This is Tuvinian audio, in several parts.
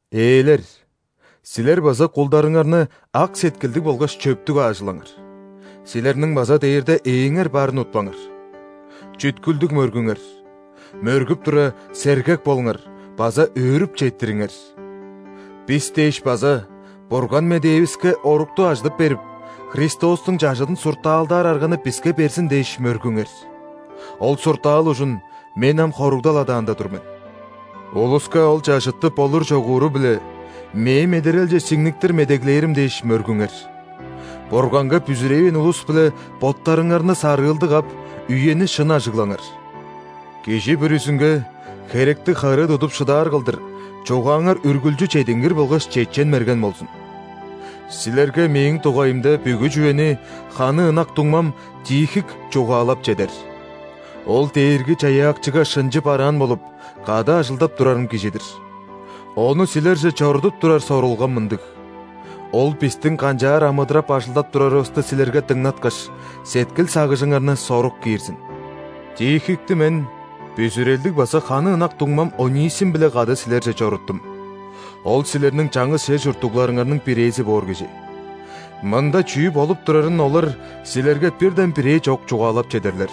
Ээлер, силер база кулдарыңарны ак сеткилдиг болгаш чөптүг аажылаңар. Силерниң база дээрде Ээңер барын утпаңар. Чүткүлдүг мөргүңер, мөргүп тура, сергек болуңар база өөрүп четтириңер! Бис дээш база Бурган медээвиске орукту ажыдып берип, Христостуң чажыдын суртаалдаар арганы биске берзин дээш, мөргүңер. Ол суртаал ужун мен ам хоругдал адаанда тур мен. Улуска ол чажытты болур-чогууру-биле, мээ-медерелче сиңниктир медеглээрим дээш, мөргүңер. Бурганга бүзүревээн улус-биле боттарыңарны сарыылдыг ап, үени шын ажыглаңар. Кижи бүрүзүнге херектиг харыы тудуп шыдаар кылдыр, чугааңар үргүлчү чедингир болгаш чечен-мерген болзун. Силерге мээң дугайымда бүгү чүвени ханы ынак дуңмам Тихик чугаалап чедер. Ол Дээрги-Чаяакчыга шынчы бараан болуп, кады ажылдап турарым кижи-дир. Ону силерже чорудуп турар сорулгам мындыг: ол бистиң канчаар амыдырап-ажылдап турарывысты силерге дыңнаткаш, сеткил-сагыжыңарны сорук киирзин. Тихикти мен бүзүрелдиг база ханы ынак дуңмам Онисим-биле кады силерже чоруттум. Ол силерниң чаңгыс чер чурттугларыңарның бирээзи боор кижи. Мында чүү болуп турарын олар силерге бирден-бирээ чок чугаалап чедерлер.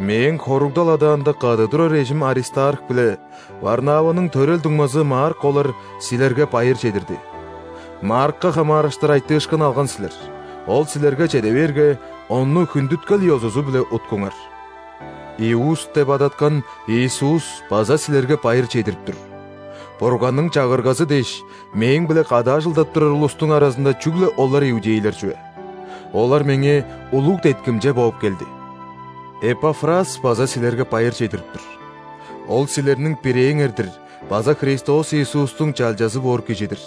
Мээң хоругдал адаанда кады турар эжим Аристарх биле Варнаваның төрел дуңмазы Марк олар силерге байыр чедирди. (Маркка хамаарыштыр айтыышкын алган силер: ол силерге чеде бээрге, ону хүндүткел ёзузу-биле уткуңар.) Иуст деп адаткан Иисус база силерге байыр чедирип тур. Бурганның Чагыргазы дээш, мээң-биле кады ажылдап турар улустуң аразында чүгле олар иудейлер чүве. Олар меңээ улуг деткимче бооп келди. Эпафрас база силерге байыр чедирип тур. Ол силерниң бирээңер-дир база Христос Иисустуң чалчазы боор кижи-дир.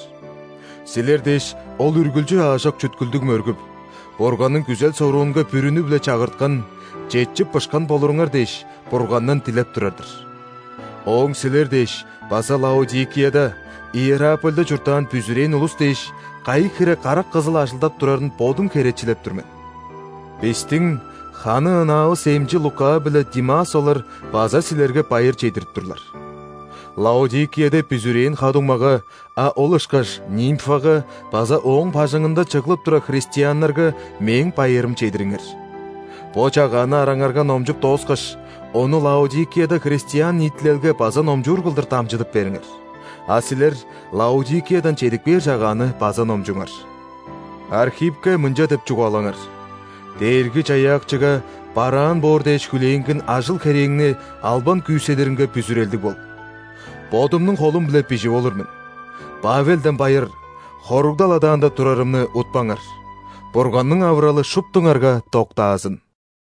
Силер дээш, ол үргүлчү аажок чүткүлдүг мөргүп, Бурганның күзел-соруунга бүрүнү-биле чагырткан, четчип-бышкан болуруңар дээш, Бургандан дилеп турар-дыр. Ооң силер дээш база Лаодикияда, Иерапольда чурттаан бүзүрээн улус дээш, кайы хире карак кызыл ажылдап турарын бодум херечилеп тур мен. Бистиң ханы ынаавыс эмчи Лука биле Димас олар база силерге байыр чедирип турлар. Лаодикияда бүзүрээн ха-дуңмага, а ол ышкаш Нимфага база ооң бажыңында чыглып турар христианнарга мээң байырым чедириңер. Бо чагааны араңарга номчуп дооскаш, ону Лаодикияда христиан ниитилелге база номчуур кылдыр дамчыдып бериңер. А силер Лаодикиядан чедип кээр чагааны база номчуңар. Архиппке мынча деп чугаалаңар: «Дээрги-Чаяакчыга бараан боор дээш хүлээнген ажыл-херээңни албан күүседиринге бүзүрелдиг бол». Бодумнуң холум-биле бижип олур мен: Павелден байыр. Хоругдал адаанда турарымны утпаңар. Бурганның авыралы шуптуңарга доктаазын!